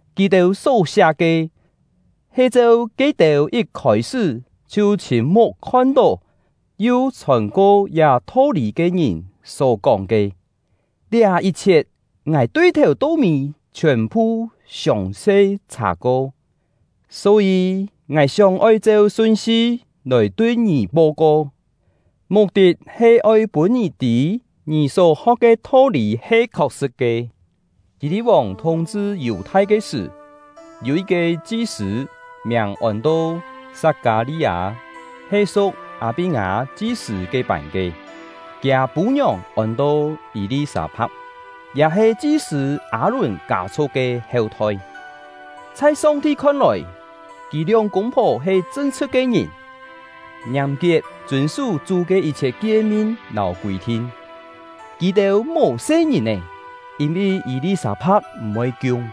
Kì-têu só-siá ke, he cheu ke-têu yit khôi-sṳ́ chhiu chhîn-muk khon-tó yu chhòn-ko liá tho-lî ke ngìn só-kóng ke. Liá yit-chhiet, ngài tui-thèu-to-mî chhiòn-phu siòng-se chhà-ko, só-yî ngài sióng-oi cheu sun-si lòi tui ngì po-ko, muk-tit he oi pûn ngì tî ngì só-ho̍k ke tho-lî he khok-sṳ̍t ke. Hî-li̍t-vòng thúng-chhṳ Yù-thai ke sṳ̀, yû yit-ke chi-sṳ̂, miàng ôn-to Sat-kâ-li-â, he su̍k Â-pí-ngâ chi-sṳ̂ ke-pân ke; kiâ pû-ngiòng ôn-to Yî-li-sâ-pha̍k, ya he chi-sṳ̂ Â-lùn kâ-chhu̍k ke heu-thoi. Chhai Song-ti khon-lòi, kì lióng kûng-phò he chṳn-chhṳ̍t ke ngìn, ngiàm-kiet chûn-sú Chú ke yit-chhiet kie-min lâu kûi-thin. Kì-têu mò se-ngìn-è, yîn-vi Yî-li-sâ-pha̍k m̀-voi kiung;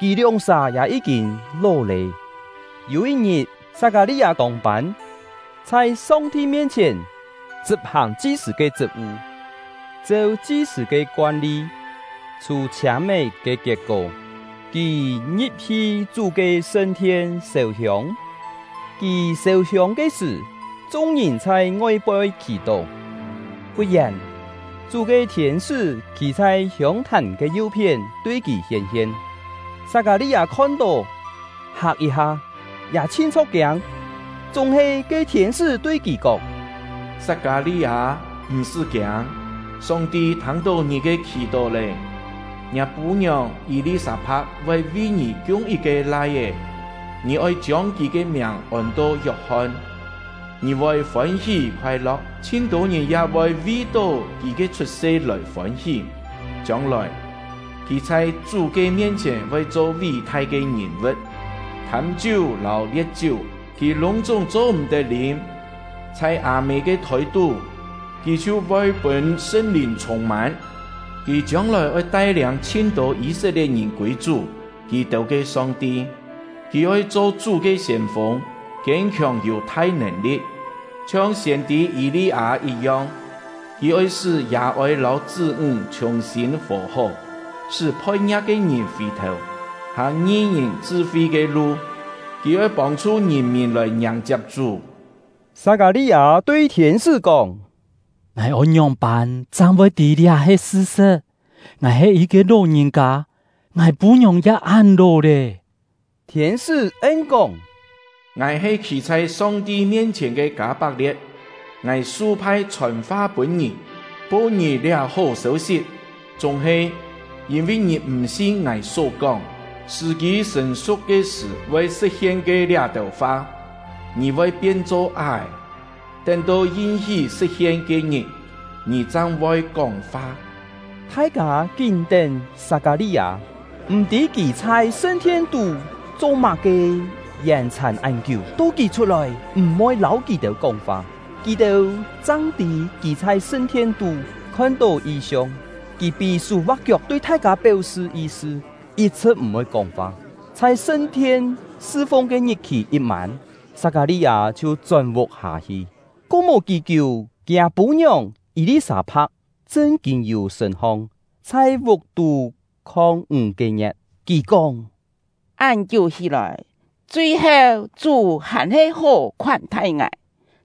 kì lióng-sà ya yí-kîn ló lé. Yû yit-ngit, Sat-kâ-li-â tông-pân, chhai Song-ti mien-chhièn chṳp-hàng chi-sṳ̂ ke chṳt-vu. Cheu chi-sṳ̂ ke koan-li, chhû-chhiâm-é ke kiet-kó, kì ngi̍p-hi Chú ke sṳn-thien sêu-hiông. Kì sêu-hiông ke sṳ̀, chung-ngìn chhai ngoi-poi khì-tó. Fut-yèn, Chú ke thiên-sṳ́ khî chhai hiông-thàn ke yu-phién tui kì hién-hien; Sat-kâ-li-â khon-tó, hak yit-ha, ya chhin chho̍k-kiâng. Chúng-he ke thiên-sṳ́ tui kì kóng: “Sat-kâ-li-â, m̀-sṳ́ kiâng! Song-ti thâng-tó ngì ke khì-tó lé; ngiâ pû-ngiòng Yî-li-sâ-pha̍k voi vi ngì kiung yit-ke lai-é, ngì oi chiông kì ke miàng ôn-to Yok-hon. Ngì voi fôn-hí khoai-lo̍k; chhin-tô ngìn ya voi vi-tó kì ke chhut-se lòi fôn-hí. Chiông-lòi, kì chhai Chú ke mien-chhièn voi cho ví-thai ke ngìn-vu̍t. Thâm-chiú lâu lie̍t-chiú, kì lûng-chúng cho-m̀-tet lîm; chhai â-mê ke thôi-tú, kì chhiu voi pûn Sṳn-Lìn chhûng-mân. Kì chiông-lòi oi tai-liâng chhin-tô Yî-set-lie̍t-ngìn kûi Chú — kì-têu ke Song-ti. Kì oi cho Chú ke siên-fûng, kiên-khiòng yû thai nèn-li̍t, chhiong siên-tî Yî-li-â yit-yong. Kì oi sṳ́ yà-ôi lâu chṳ́-ńg chhùng-sîn fò-hó, sṳ́ phoi-ngia̍k ke ngìn fì-thèu, hàng ngi-ngìn chṳ-fi ke lu; kì oi pông-chhu ngìn-mìn lòi ngiàng-chiap Chú.” Sat-kâ-li-â tui thiên-sṳ́ kóng: “Ngài oi ngióng-pân chang voi tî liá he sṳ-sṳ̍t? Ngài he yit-ke ló-ngìn-kâ, ngài pû-ngiòng ya án ló lé.” Thiên-sṳ́ en-kóng: “Ngài he khî chhai Song-ti mien-chhièn ke Kâ-pak-lie̍t; ngài su-phai chhòn-fa pûn ngì, po ngì liá hó sêu-sit. Chúng-he, yîn-vi ngì m̀ sin ngài só kóng, sṳ̀-kî sṳ̀n-su̍k ke sṳ̀ voi sṳ̍t-hien ke liá-têu fa, ngì voi pien-cho á-è; tén-to yin-hí sṳ̍t-hien ke-ngit, ngì chang voi kóng-fa.” Thai-kâ kín tén Sat-kâ-li-â, m̀-tî kì chhai sṳn-thien-tú cho-má-ke yèn-chhàn án kiú. To kì chhut-lòi, m̀-voi lâu kì-têu kóng-fa, kì-têu chang tî kì chhai sṳn-thien-tú khon-tó yi-siong. Kì pí-sú va̍k-kiok tui thai-kâ péu-sṳ yi-sṳ, yit-chhṳ̍t m̀-voi kóng-fa. Chhai sṳn-thien sṳ-fung ke ngit-khì yit mân, Sat-kâ-li-â chhiu chón vuk-hâ hi. Ko mò kí-kiú, kiâ pû-ngiòng Yî-li-sâ-pha̍k chṳn-kîn yû sṳ̂n-hong, chhai vuk-tú khong ńg-ke ngie̍t. Kì kóng: “Án-kiú hí-lòi, chui-heu Chú hàn-he hó khoán-thai ngài,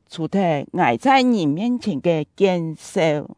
chhù-thet ngài chhai ngìn mien-chhièn ke kien-seu.”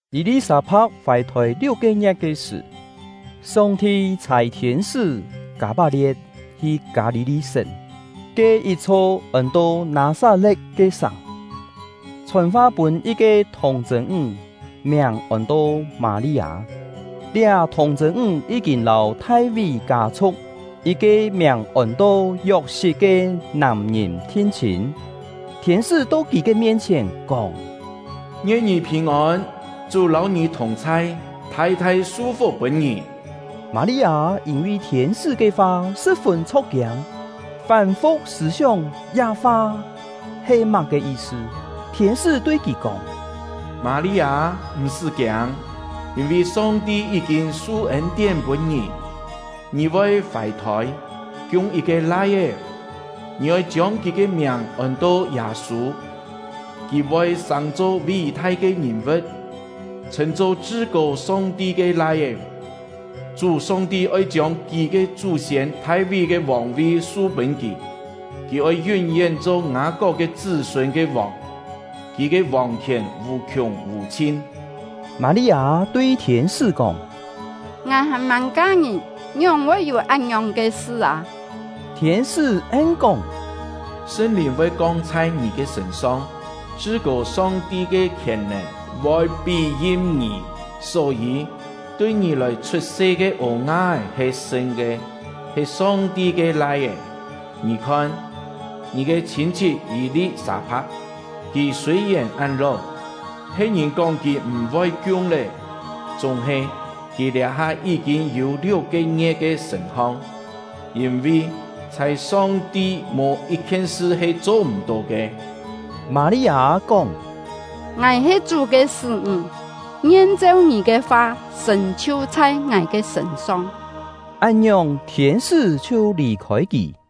Yî-li-sâ-pha̍k fài-thôi liuk-ke ngie̍t ke sṳ̀, Song-ti chhâi thiên-sṳ́ Kâ-pak-lie̍t hi Kâ-li-li-sén ke yit-chho ôn-to Nâ-sat-le̍t ke sàng, chhòn-fa pûn yit-ke thùng-chṳ̂n-ńg, miàng ôn-to Mâ-li-â; liá thùng-chṳ̂n-ńg yí-kîn lâu Thai-ví kâ-chhu̍k yit-ke miàng ôn-to Yok-sit ke nàm-ngìn thin-chhîn. Thiên-sṳ́ to kì ke mien-chhièn, kóng: “Ngien ngì phìn-ôn! Chú lâu ngì thùng-chhai, thai-thai su-fuk pûn ngì!” Mâ-li-â yîn-vi thiên-sṳ́ ke fa, sṳ̍p-fûn chho̍k-kiâng, fán-fu̍k sṳ̂-sióng liá fa he má-ke yi-sṳ. Thiên-sṳ́ tui kì kóng: “Mâ-li-â, m̀-sṳ́ kiâng, yîn-vi Song-ti yí-kîn su ên-tién pûn ngì. Ngì voi fài-thôi, kiung yit-ke lai-é; ngì oi chiông kì ke miàng ôn-to Yâ-sû. Kì voi sàng-cho ví-thai ke ngìn-vu̍t, chhṳ̂n-cho Chṳ-kô Song-ti ke Lai-é. Chú — Song-ti oi chiông kì ke chú-siên Thai-ví ke vòng-vi su-pûn kì. Kì oi yún-yén cho Ngâ-kok ke chṳ́-sûn ke vòng; kì ke vòng-khièn vù-khiùng vù-chhin.” Mâ-li-â tui thiên-sṳ́ kóng: “Ngài hàn-màng ka-ngìn, ngióng-pân voi yû án-ngiòng ke sṳ â?” Thiên-sṳ́ en-kóng: “Sṳn-Lìn voi kong chhai ngì ke sṳ̂n-song; Chṳ-kô Song-ti ke khièn-nèn voi pí-yim ngì. Só-yî, tui ngì lòi chhut-se ke ô-nga-é he sṳn ke, he Song-ti ke Lai-é. Ngì khon, ngì ke chhîn-chhit Yî-li-sâ-pha̍k, kì sûi-yèn án ló, phe̍t-ngìn kóng kì m̀-voi kiung lé, chúng-he kì liá-ha yí-kîn yû liuk-ke ngie̍t ke sṳ̂n-hong. Yîn-vi chhai Song-ti mò yit-khien sṳ he cho m̀-tó ke.” Mâ-li-â kóng: “Ngài he Chú ke sṳ́-ńg; ngien cheu ngì ke fa sṳ̀n-chhiu chhai ngài ke sṳ̂n-song.” Án-ngiòng, thiên-sṳ́ chhiu lì-khôi kì.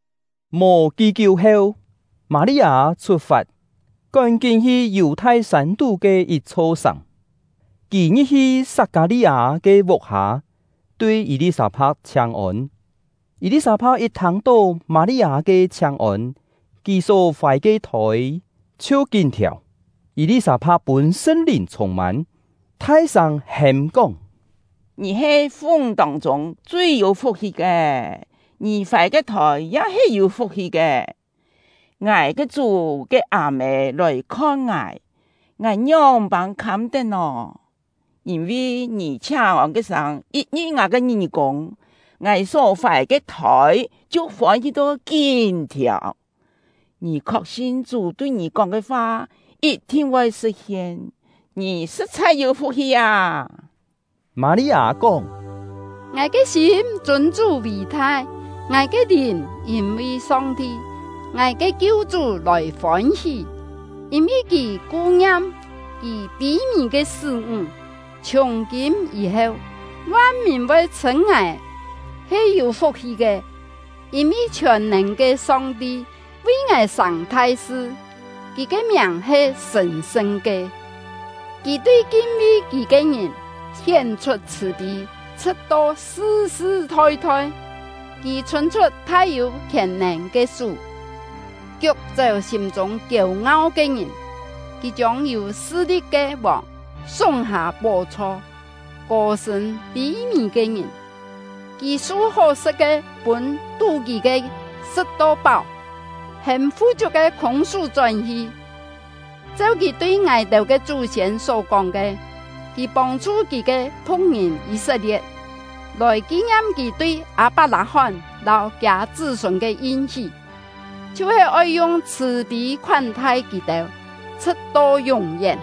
Mò kí-kiú heu, Mâ-li-â chhut-fat, kón-kín hi Yù-thai sân-tú ke yit-chho sàng. Kì ngi̍p-hi Sat-kâ-li-â ke vuk-hâ, tui Yî-li-sâ-pha̍k chhiáng-ôn. Yî-li-sâ-pha̍k yit thâng-tó Mâ-li-â ke chhiáng-ôn, kì só fài ke thôi chhiu kín thiàu. Yî-li-sâ-pha̍k pûn Sṳn-Lìn chhûng-mân, thai-sâng hêm-kóng: “Ngì he fu-ńg tông-chûng chui yû fuk-hi ke! Ngì fài ke thôi ya he yû fuk-hi ke! Ngài ke Chú ke â-mê lòi-khon ngài, ngài ngióng-pân khâm-tet nò? Yîn-vi ngì chhiáng-ôn ke sâng yit ngi̍p ngài ke ngí-kûng, ngài só fài ke thôi chhiu fôn-hí to kín thiàu. Ngì khok-sin Chú tui ngì kóng ke fa yit-thin voi sṳ̍t-hien; ngì sṳ̍t-chhai yû fuk-hi â!” Mâ-li-â kóng: “Ngài ke sîm chûn Chú vì-thai; ngài ke lìn yîn-vi Song-ti — ngài ke kiu-chú lòi fôn-hí; yîn-vi Kì ku-ngiam Kì pî-mì ke sṳ́-ńg. Chhiùng-kîm yî-heu, van-mìn voi chhṳ̂n ngài he yû fuk-hi ke, yîn-vi Chhiòn-nèn ke Song-ti vi ngài sàng thai-sṳ. Kì ke miàng he sṳ̀n-sṳn ke; Kì tui kin-vi Kì ke ngìn hién-chhut chhṳ̀-pî, chhṳ̍t-to sṳ-sṳ thoi-thoi. Kì chhûn-chhut thai-yû khièn-nèn ke sú, kiuk-chéu sîm-chûng kiêu-ngau ke ngìn. Kì chiông yû sṳ-li̍t ke vòng súng-hâ pó-chho, kô-sṳ̂n pî-mì ke ngìn. Kì su hó-sṳ̍t ke pûn tú-kî ke sṳ̍t-to páu, hêm fu-chiuk ke khûng-sú chón-hi. Cheu Kì tui ngài-têu ke chú-siên só-kóng ke, Kì pông-chhu Kì ke phu̍k-ngìn Yî-set-lie̍t, lòi ki-ngiam Kì tui Â-pak-lâ-hón lâu kiâ chṳ́-sûn ke yin-hí, chhiu-he oi yung chhṳ̀-pî khoán-thai kì-têu, chhṳ̍t-to yún-yén!”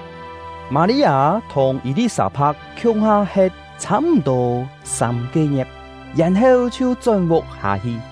Mâ-li-â thùng Yî-li-sâ-pha̍k khiung-ha he̍t chhâ-m̀-tô sâm-ke ngie̍t, yèn-heu chhiu chón vuk-hâ hi.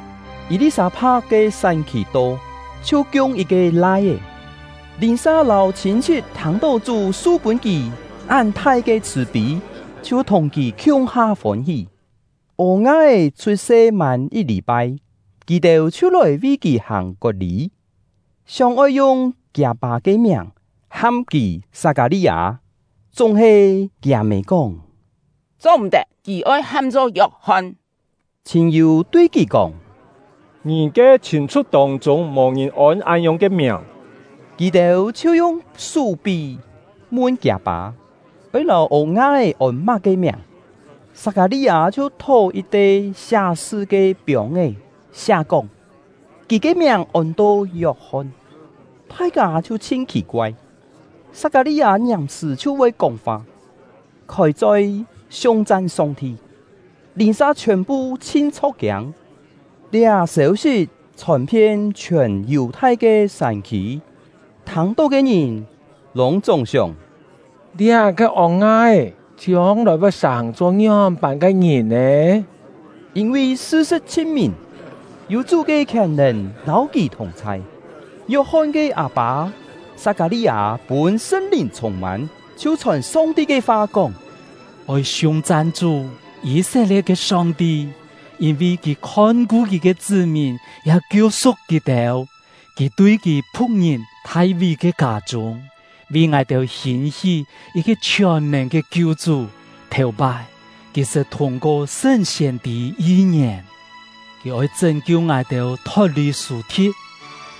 Yî-li-sâ-pha̍k ke sán-khì to, chhiu kiung yit-ke lai-é. Lìn-sa lâu chhîn-chhit thâng-tó Chú su-pûn kì án thai ke chhṳ̀-pî, chhiu thùng kì khiung-ha fôn-hí. Ô-nga-é chhut-se mân yit lî-pai, kì-têu chhiu lòi vi kì hàng kot-lî, sióng-oi yung kiâ-pâ ke miàng ham kì Sat-kâ-li-â. Chúng-he kiâ-mê kóng: “Cho-m̀-tet! Kì oi ham-cho Yok-hon.” Chhîn-yû tui kì kóng: “Ngì ke chhîn-chhu̍k tông-chûng mò-ngìn ôn án-ngiòng ke miàng.” Kì-têu chhiu yung sú pí mun kiâ-pâ, oi lâu ô-nga-é ôn má-ke miàng. Sat-kâ-li-â chhiu thó yit-te siá-sṳ ke piông-é, siá-kóng: “Kì ke miàng ôn-to Yok-hon.” Thai-kâ chhiu chhin khì-koai. Sat-kâ-li-â ngiàm-sṳ̀ chhiu voi kóng-fa, khôi-choi siung-chan Song-ti. Lìn-sa chhiòn-phu chhin chho̍k-kiâng. Liá sêu-sit chhòn-phien chhiòn Yù-thai ke sân-khî; thâng-tó ke ngìn lûng-chúng sióng: “Liá-ke ô-nga-é chiông-lòi voi sàng-cho ngióng-pân ke ngìn nè?” Yîn-vi sṳ-sṳ̍t chhin mìn, yû Chú ke khièn-nèn lâu kì thùng-chhai. Yok-hon ke â-pâ Sat-kâ-li-â pûn Sṳn-Lìn chhûng-mân, chhiu chhòn Song-ti ke fa, kóng: “Oi siung-chan Chú — Yî-set-lie̍t ke Song-ti! Yîn-vi Kì khon-ku Kì ke chṳ́-mìn, ya kiu-su̍k kì-têu. Kì tui Kì phu̍k-ngìn Thai-ví ke kâ-chûng, vi ngài-têu hîn-hí yit-ke chhiòn-nèn ke Kiu-chú. Thèu-pái, Kì sṳt thûng-ko sṳn siên-tî yi-ngièn: Kì oi chṳ́n-kiu ngài-têu thot-lì sù-thi̍t,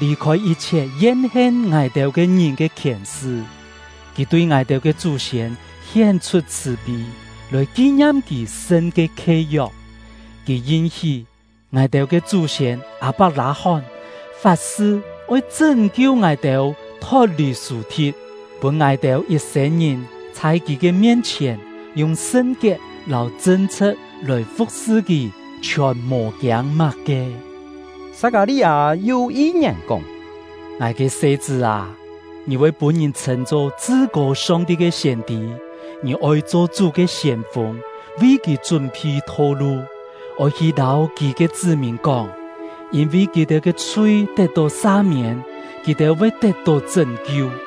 lì-khôi yit-chhiet yen-hen ngài-têu ke ngìn ke khièn-sṳ. Kì tui ngài-têu ke chú-siên hién-chhut chhṳ̀-pî, lòi ki-ngiam Kì sṳn ke khie-yok. Kì yin-hí ngài-têu ke chú-siên Â-pak-lâ-hón, fat-sṳ oi chṳ́n-kiu ngài-têu thot-lì sù-thi̍t, pûn ngài-têu yit-sên-ngìn chhai Kì ke mien-chhièn, yung sṳn-kiet lâu chṳn-chhṳ̍t lòi fu̍k-sṳ Kì, chhiòn mò kiâng má-ke.” Sat-kâ-li-â yu yi-ngièn kóng: “Ngài ke se-chṳ́ â, ngì voi pûn-ngìn chhṳ̂n-cho Chṳ-kô Song-ti ke siên-tî. Ngì oi cho Chú ke siên-fûng, vi kì chún-phi tho-lu; oi hi lâu Kì ke chṳ́-mìn kóng: Yîn-vi kì-têu ke chhui tet-tó sa-miên, kì-têu voi tet-tó chṳ́n-kiu.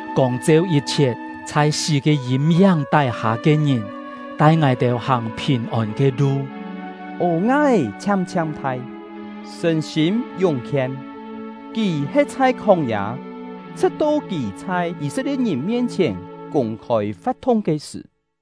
kông-cheu yit-chhiet chhai sí ke yîm-yáng tái-hâ ke ngìn, tai ngài-têu hàng phìn-ôn ke lu.” Ô-nga-é chhiam-chhiam thai, sṳ̂n-sîm yúng-khien. Kì he̍t chhai khóng-yâ, chhṳ̍t-to kì chhai Yî-set-lie̍t-ngìn mien-chhièn kûng-khôi fa̍t-thung ke sṳ̀.